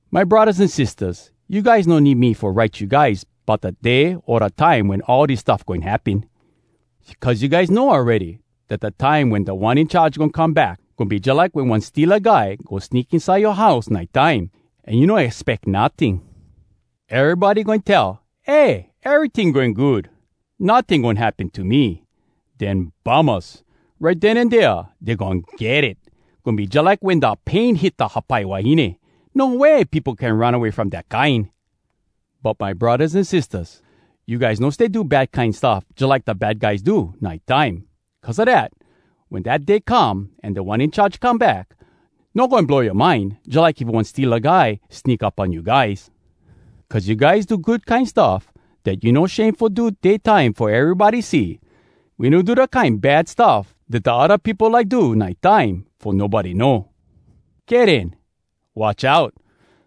My braddahs an sistahs, you guys no need me fo write you guys bout da day o da time wen all dis stuff goin happen. Cuz you guys know awready dat da time wen Da One In Charge goin come back, goin be jalike wen one steala guy go sneak inside yoa house nite time, an you no expeck notting. Erybody goin tell, “Eh, eryting goin good! Notting goin happen to me!” Den bummahs! Right den an dea dey goin get it! Goin be jalike wen da pain hit da hapai wahine. No way peopo can run away from dat kine! But my braddahs an sistahs, you guys no stay do bad kine stuff jalike da bad guys do, nite time. Cuz a dat, wen dat day come an Da One In Charge come back, no goin blow yoa mind jalike if one steala guy sneak up on you guys. Cuz you guys do good kine stuff dat you no shame fo do day time fo erybody see. We no do da kine bad stuff dat da odda peopo like do nite time fo nobody know. Kay den. Watch out!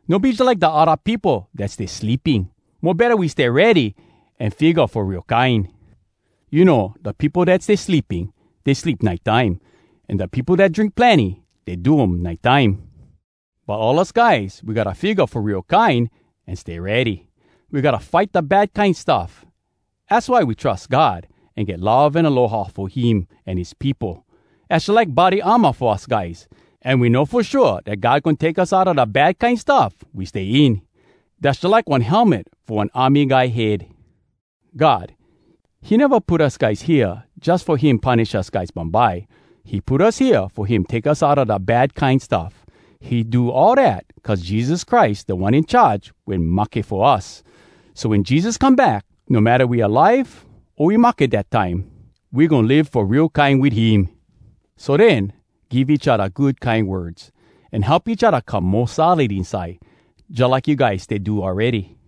No be jalike da odda peopo dat stay sleeping. Mo betta we stay ready, an figga fo real kine. You know, da peopo dat stay sleeping, dey sleep nite time. An da peopo dat drink plenny, dey do um nite time. But all us guys, we gotta figga fo real kine an stay ready. We gotta fight da bad kine stuff. Az why we trus God, an get love an aloha fo him an his peopo. Dass jalike body armor fo us guys. An we know fo shua dat God goin take us outa da bad kine stuff we stay in. Dass jalike one helmet fo one army guy head. God, he neva put us guys hea jus fo him punish us guys bumbye. He put us hea fo him take us outa da bad kine stuff. He do all dat cuz Jesus Christ, Da One In Charge, wen mahke fo us. So wen Jesus come back, no matta we alive o we mahke dat time, we goin live fo real kine wit him! So den, give each odda good kine words, an help each odda come mo solid inside, jalike you guys stay do awready.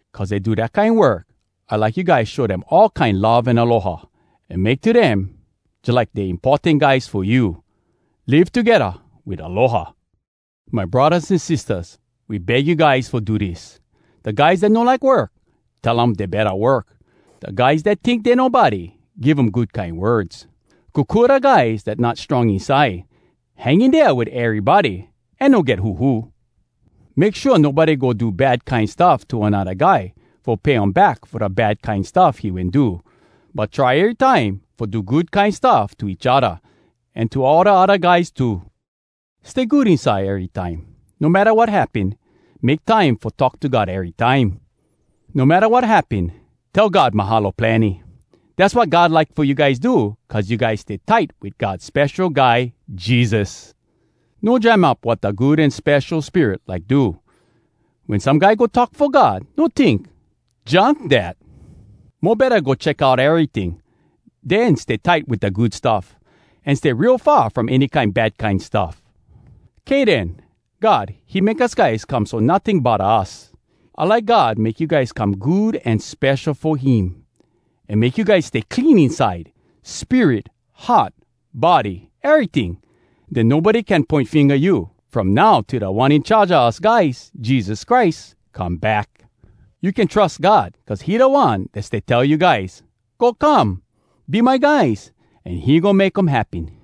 Cuz dey do dat kine work, I like you guys show dem all kine love an aloha, an make to dem jalike dey importan guys fo you. Live togedda wit aloha. My braddahs an sistahs, we beg you guys fo do dis: Da guys dat no like work, tell um dey betta work. Da guys dat tink dey nobody, give um good kine words. Kokua da guys dat not strong inside. Hang in dea wit erybody, an no get huhu. Make shua nobody go do bad kine stuff to anodda guy fo pay um back fo da bad kine stuff he wen do. But try erytime fo do good kine stuff to each odda, an to all da odda guys too. Stay good inside erytime. No matta wat happen, make time fo talk to God erytime. No matta wat happen, tell God “Mahalo plenny!” Dass wat God like fo you guys do cuz you guys stay tight wit God Spesho Guy Jesus. No jam up wat da Good An Spesho Spirit like do. Wen some guy go talk fo God, no tink, “Junk, dat!” Mo betta, go check out eryting, den stay tight wit da good stuff. An stay real far from any kine bad kine stuff. Kay den, God, he make us guys come so notting bodda us. I like God make you guys come good an spesho fo him; an make you guys stay clean inside—spirit, heart, body, eryting! Den nobody can poin finga you, from now till Da One In Charge a us guys, Jesus Christ, come back. You can trus God cuz he da One dat stay tell you guys “Go come! Be my guys!” an he goin make um happen.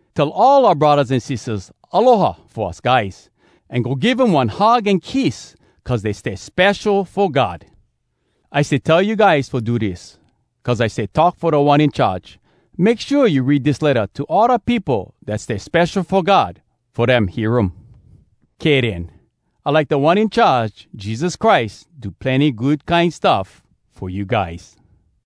Tell all oua braddahs an sistahs “Aloha!” fo us guys, an go give um one hug an kiss cuz dey stay spesho fo God. I stay tell you guys fo do dis, cuz I stay talk fo Da One In Charge: Make shua you read dis letta to all da peopo dat stay spesho fo God fo dem hear um. Kay den. I like Da One In Charge, Jesus Christ, do plenny good kine stuff fo you guys.